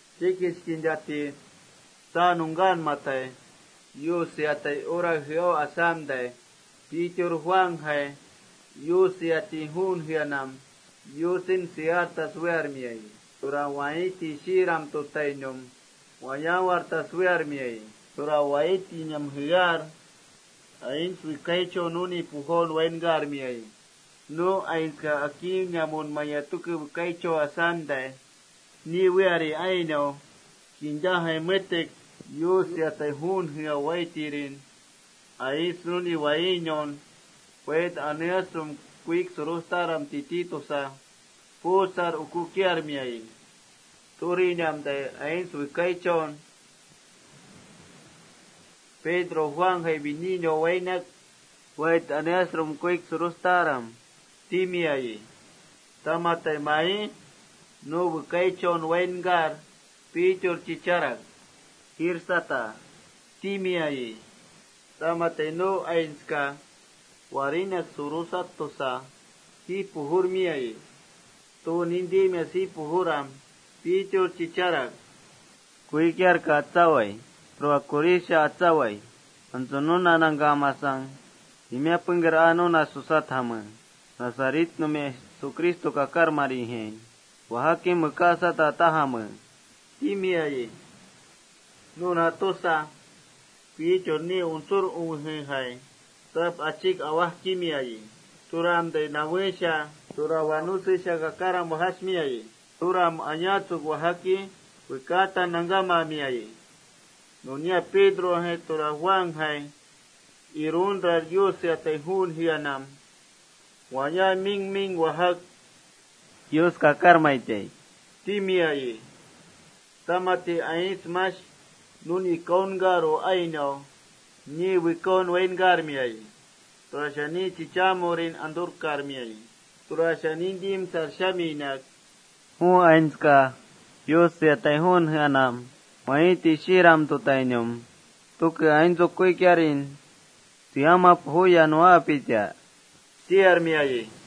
Chikich kintati tsaa nungkaanmatai, Yus seatai hora jeau asamtai, Pedro Juanjai Yus seatai juun jeanam Yusen seartas wearmiayi. Tura Waiiti Shiiram tutainum wayaawartas wearmiayi. Tura waiitinam jear, aints wekaichau nuni pujaun wainkarmiayi. Nu aintska akiinamunmaya tuke wekaichau asamtai, ni weari ainau kintajai metek Yus seatai juun jea waiitirin aints nuni waainaun: Wait aneasrum kuik surustaram titi tusar puusar ukukiarmiayi. Turinamtai aints wekaichau Pedron Juanjai wininaun wainak: —Wait aneasrum, kuik surustaram, —timiayi. Tamati mai nu wekaichaun wainkar, Pedro chicharak: —Jiirsata, —timiayi. Tamati nu aintska: ¿Warinak surustas taj? tusa jiij pujurmiayi. Tu nintimias jiij pujuram, Pedro chicharak: —Kuikiarka atsawai. Tura kurisha atsawai. Antsu nuna nangkamasang timiá pengker aa nuna susatjame. Nazaretnumia Jesucristo kakarmarijai wajakim wekaasata tajame, —timiayi. Nuna tusa Pedro ni untsur uwejejai tap achik awajkimiayi. Turamtai nawesha, tura wanusesha kakaram wajasmiayi. Turam ayaatsuk wajaki, wekaatan nangkamamiayi. Nunia Pedrojai, tura Juanjai iruntrar Yus seatai juun jeanam waya ming ming wajak: Yus kakarmaitai timiayi. Tamati aints mash nuni kaunkaru ainau niin wekaun wainkarmiayi. Tura ni chichaamurin anturkarmiayi. Tura nintimsar shaminak: —Ju aintska Yus seatai juun jeanam Waiiti Shiiram tutainum tuke aintsu kuikiarin seama pujuya nuwaapita, —tiarmiayi.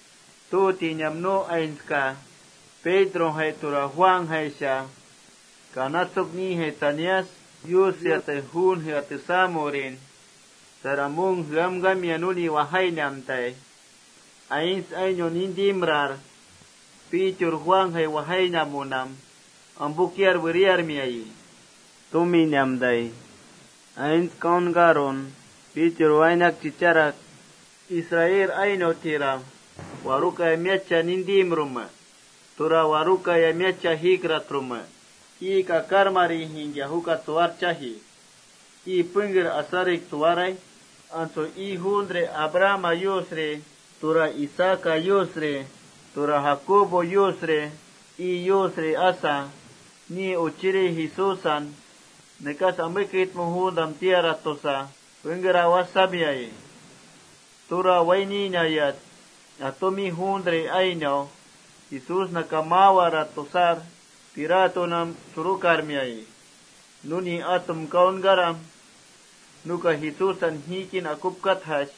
Tu tinamtai nu aintska Pedrojai tura Juanjaisha kanatsuk nijai tsanias Yus seatai juun jea tesaamurin Salomón jeamkamia nuni wajainamtai, aints ainau nuna wainkaru asar, nuni ampukiar weriarmiayi. Tuminamtai Pedro aints kaunkarun chicharak: —Israel ainautiram ¿warukaya miatcha nintimrume? ¿Tura warukaya miatcha jiikratrume? Ii kakarmarijaingkia juka tsuwarchaji. ¿Ii pengker asarik tsuwaraij? Antsu ii juuntri Abrahama Yusri, tura Isaaca Yusri, tura Jacobo Yusri ii Yusri asa, ni uchirin Jesúsan: Nekas ameketme juuntam tiarat tusa pengker awajsamiayi. Tura waininayat atumi juuntri ainau: Jesúsnaka maawarat tusar, Pilatonam surukarmiayi. Nuni atum kaunkaram, Pilatoka: Jesúsan jiikin akupkatjash,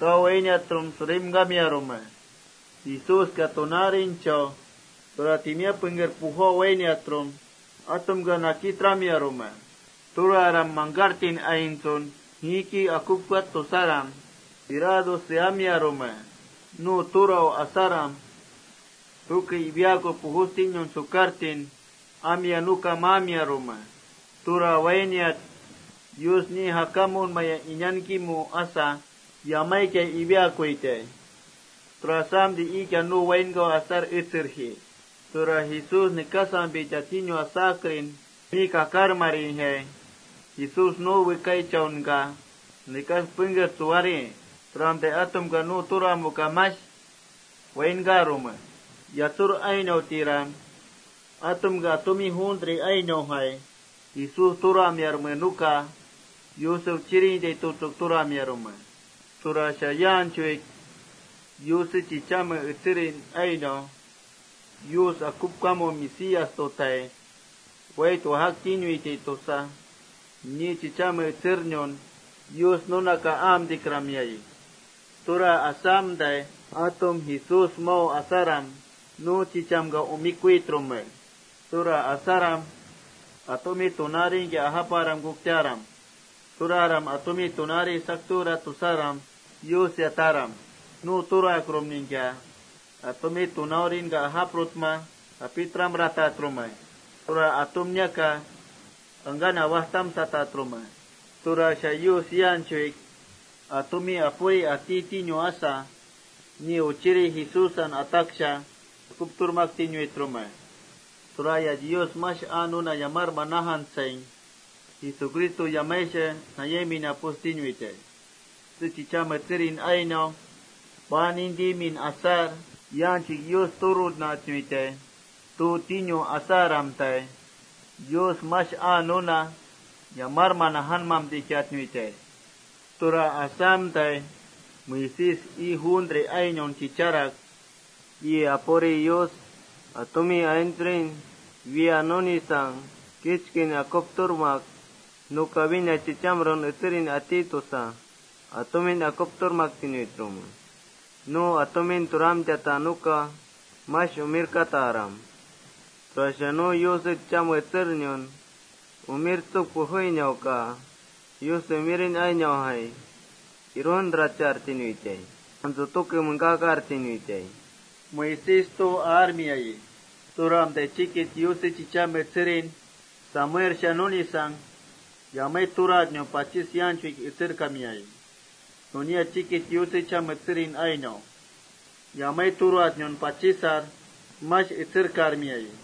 tau wainiatrum surimkamiarume. Jesúska tunaarinchau tura timiá pengker pujau wainiatrum, atumka nakitramiarume. Antsu mangkartin aintsun jiiki akupkati tusaram, Pilato seamiarume. Nu turau asaram, tuke iwiaaku pujustinun sukartin amia nuka maamiarume. Tura wainiat Yus niin jakamunmaya inankimu asa, yamaikia iwiaakuitai. Tura asamtai iikia nu wainkau asar etserji.+ “Tura Jesús nekasampita tinu asakrin, ni kakarmarijai Jesús ju wekaichaunka nekas pengker tsuwari. Turamtai atumka ju turamuka mash wainkarume. “Yatsur ainautiram, antuktaram. Atumka atumi juuntri ainaujai Jesús turamiarme nuka Yuse uchirintai tutsuk turamiarme. Tura yaanchuik Yuse chichamen etserin ainau: Yus akupkamu Mesías tutai wait wajaktinuitai tusa, ni chichamen etsernun Yus nunaka aamtikramiayi. Tura asamtai atum Jesús mau asaram, nu chichamka umikuitrume. Tura asaram atumi yaanchuik nintimtairingkia yapajiaram atumi tunaari Yus sakturat tusaram seataram. Nu turakrumningkia atumi tunaarinka sakturmartatrume. Tura atumniaka angkan awajtamsatatrume. Tura Yus yaanchuik: Atumi Apuri ati tinu asa, ni uchirin Jesúsan ataksha akupturmaktinuitrume. Turayat Yus mash aa nuna yamarman najantsaing, Jesucristo yamaisha nayaimpinam pujustinuitai. Yuse chichame etserin ainau paan nintimin asar yaanchuik: Yus turunatnuitai tu tinu asaramtai, Yus mash aa nuna ataksha yamarman najanatnuitai. Tura asamtai Moisés ii juuntri ainaun chicharak: ‘Ii Apuri Yus atumi aintsrin wiya nunisang kichkin akupturmak: Nuka wína chichamrun etserin ati tusa, atumin akupturmaktinuitrume. Nu atumin turamtiata nuka mash umirkataram. Tura nu Yuse chichamen etsernun umirtsuk pujuinauka Yusnau ainaujaingkia iruntrarchatnuitai, antsu tuke mengkakartinuitai,’ Moisés tu aarmiayi. “Nunia Yuse chichame etserin Samuelsha nunisang yamai turatnun pachis yaanchuik etserkamiayi. Nunia chikich Yuse chichame etserin ainausha yamai turatnuncha pachisar mash etserkarmiayi.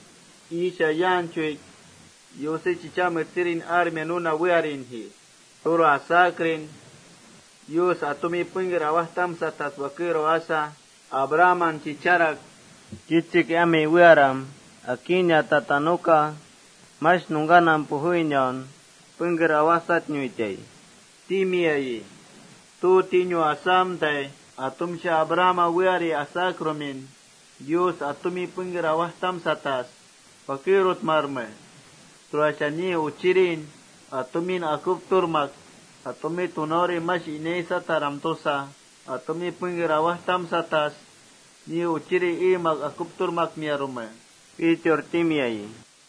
Iisha yaanchuik Yuse chichame etserin armia nuna wearinji. Tura asakrin Yus atumin pengker awajtamsatas wakerau asa, Abrahaman chicharak: ‘Kichik ami wearam akiinatata nuka mash nungkanam pujuinaun pengker awajsatnuitai,’ timiayi. Tu tinu asamtai atumsha Abrahama weari asakrumin, Yus atumin pengker awajtamsatas wakerutmarme. Tura ni Uchirin atumin akupturmak: Atumi tunauri mash inaisataram tusa, atumin pengker awajtamsatas ni Uchirin eemak akupturmakmiarume,” Pedro timiayi.